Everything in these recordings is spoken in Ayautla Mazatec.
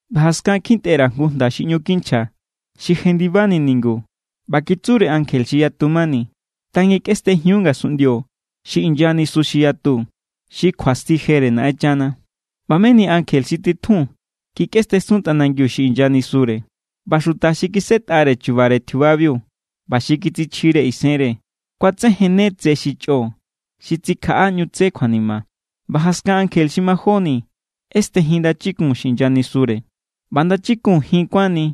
ꞌBa jaskan kjintꞌe_ra̱ jngu jnda xi ꞌñu kinchja, xi jendibani ningu. ꞌBa kitsure ankje xi yatu mani: “Tangikꞌestenjiun ngasunꞌndio xi inya nisu xi yatu, xi kjuasti jere Naꞌenchana.” ꞌBa meni ankje xi titjun kikꞌestensun tꞌanangiu xi inya nisure. ꞌBa xuta xi kisꞌetꞌare chubare tjiubabiu ꞌba xi kitsichjire isenre, kuatsejenne tse xi chꞌo xi tsikjaꞌa ꞌñu tse kjuanima. ꞌBa jaskan ankje xi majóni ꞌestejin ndachikun xi inya nisure. ꞌBa ndachikun jin kuánni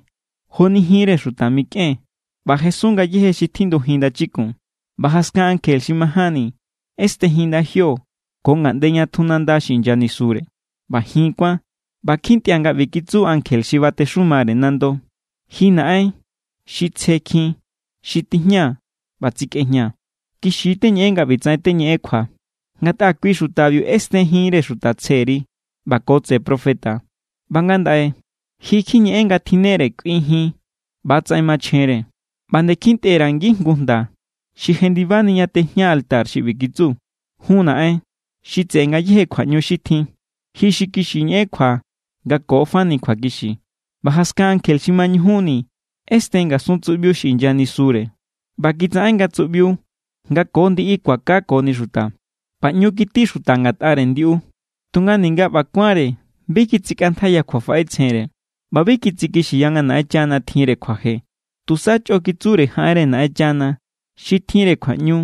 joni jinre xuta mikꞌen. ꞌBa jesun ngayéje xi tjindukunjin ndachikun. ꞌBa jaskan ankje xi majánni ꞌestejin ndajio ko ngaꞌnde ña tju nanda xi inya nisure. ꞌBa jin kuán. ꞌBa kjintꞌia̱ nga ꞌbi kitsu ankje xi batexumare nando: “Ji, Naꞌen, xi tsjekjin xi tijña ꞌba tsikꞌejña, kixi= teñeꞌen nga ꞌbitsaꞌen teñeꞌen kjua. Ngatꞌa kui xutabiu ꞌesten jinre xuta tsjeri ꞌba ko tseꞌe profeta. ꞌBa ngandaꞌe, ji kjiñeꞌen nga tjinnere kꞌui jin. ꞌBa=tsaꞌen machjenre.” ꞌBa nde kjintꞌe_ra̱ ngijngu jnda xi jendibani ña tijña altar xi ꞌbi kitsu: “Jun, Naꞌen, xi tseꞌe ngayéje kjuaꞌñu xi tjin, ji xi kixi ñeꞌen kjua nga ko fani kjuakixi.” ꞌBa jaskan ankje xi mañujunni ꞌesten ngasun tsuꞌbiu xi inya nisure. ꞌBa kitsaꞌen nga tsuꞌbiu nga ko ndiꞌi kuakakoni xuta. ꞌBa ꞌñu kití xuta ngatꞌare ndiꞌu, tunga ninga ꞌba kuánre, bi kitsikꞌantjaiya kjuafaꞌetsjenre ꞌba bi kitsikixiya nga Naꞌenchana tjinre kjuaje. Tusa chꞌo kitsure jaꞌenre Naꞌenchana xi tjinre kjuaꞌñu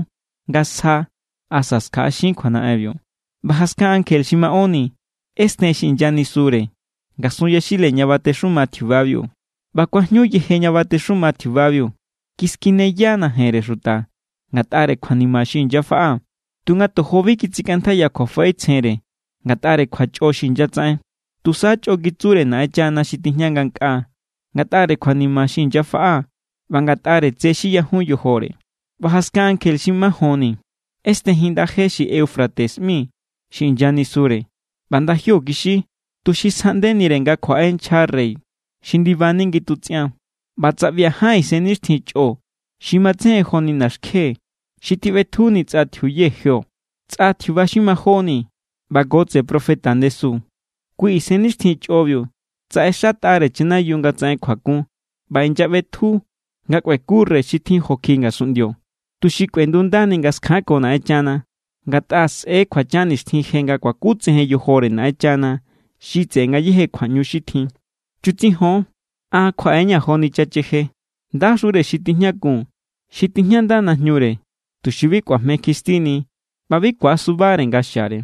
nga sja asa skjaꞌaxin kjuanaꞌenbiu. ꞌBa jaskan ankje xi maꞌónni ꞌesten xi inya nisure ngasun yaxile ña batexuma tjiubabiu. ꞌBa kuajñu yeje ña batexuma tjiubabiu. Kiskineya najenre xuta ngatꞌare kjuanima xi inyafaꞌa. Tunga tojo bi kitsikꞌantjaiya kjuafaꞌetsjenre ngatꞌare kjuachꞌo xi inyatsaꞌen. Tusa chꞌo kitsure Naꞌenchana xi tijña ngankꞌaa ngatꞌare kjuanima xi inyafaꞌa ꞌba ngatꞌare tse xi yajun yojore. ꞌBa jaskan ankje xi majonni ꞌestejin ndaje je xi Eufrates ꞌmi xi inya nisure. ꞌBa ndajio kixi, tuxi skjexꞌaꞌndenire nga kjuaꞌe nchja rey xi ndibani ngitutsꞌian. ꞌBa tsaꞌbia̱ ján isennixtjin chꞌo xi matsejen joni naxkje xi tiꞌbetjuni tsꞌa tjiuye jio, tsꞌa tjiuba xi majóni ꞌba ko tseꞌe profeta ndesu. Kui isennixtjin chꞌobiu tsaꞌexatꞌa=re chanayiu nga tsaꞌen kjuakun ꞌba inyaꞌbetju nga kꞌueku rey xi tjin jo kjiꞌi ngasunꞌndio, tuxi kꞌuendundani nga skjanko Naꞌenchana. Ngatꞌa sꞌe̱= kjuachan nixtjin je nga kuakutsejen yojore Naꞌenchana xi tseꞌe ngayéje kjuaꞌñu xi tjin. “Chutsijon, an kjuaꞌe=ña̱ joni chacheje. ¡Ndaxure xi tijñakun xi tijñanda najñure, tuxi bi kꞌuajme kjistini ꞌba bi ku̱asubare nga xiare!”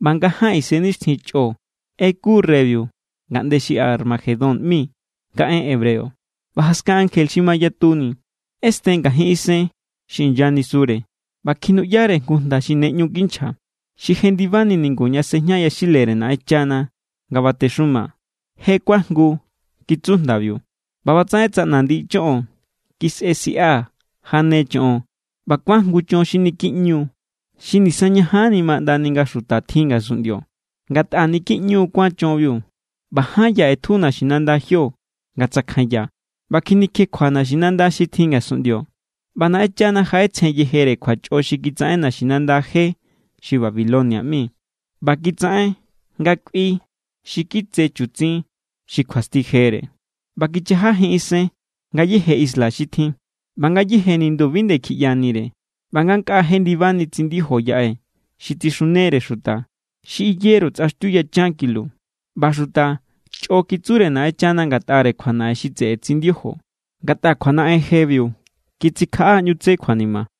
ꞌBa nga ján isennixtjin chꞌo ꞌeku reybiu ngaꞌnde xi Armagedón ꞌmi nga en hebreo. ꞌBa jaskan ankje xi mayatuni ꞌesten ngajin isen xi inya nisure. ꞌBa kjinuꞌyare jngu jnda xi ne ꞌñu kinchja, xi jendibani ningu ña sejña yaxilere Naꞌenchana nga batexuma. “Je kuajngu”, kitsu jndabiu. ꞌBa ꞌbatsaꞌen tsaꞌna ndiꞌi choꞌon, kisꞌe siꞌa, jane choꞌon, ꞌba kuán jngu chon xi niki ꞌñu=. Xi nisañajanni ma ꞌndani nga xuta tjin ngasunꞌndio, ngatꞌa niki ꞌñu kuán chonbiu. ꞌBa ján ya ꞌetju naxinanda jio nga tsakjanya, ꞌba kjinikjekjua naxinanda xi tjin ngasunꞌndio. ꞌBa Naꞌenchana jaꞌetsjen yejere kjuachꞌo xi kitsaꞌen naxinanda je xi Babilonia ꞌmi ꞌba kitsaꞌen nga kꞌui xi kitse chutsin, xi kjuasti jere. ꞌBa kichajajin isen ngayéje isla xi tjin, ꞌba ngayéje nindu bi nde kjiꞌyanire. ꞌBa ngankꞌaa jendibani tsindijo yaꞌe xi tsixunere xuta, xi iyeru tsꞌaxtiu yachan kilo. ꞌBa xuta chꞌo kitsure Naꞌenchana ngatꞌare kjuanaꞌen xi tseꞌe tsindijo, ngatꞌa kjuanaꞌen jebiu kitsikjaꞌa ꞌñu tse kjuanima.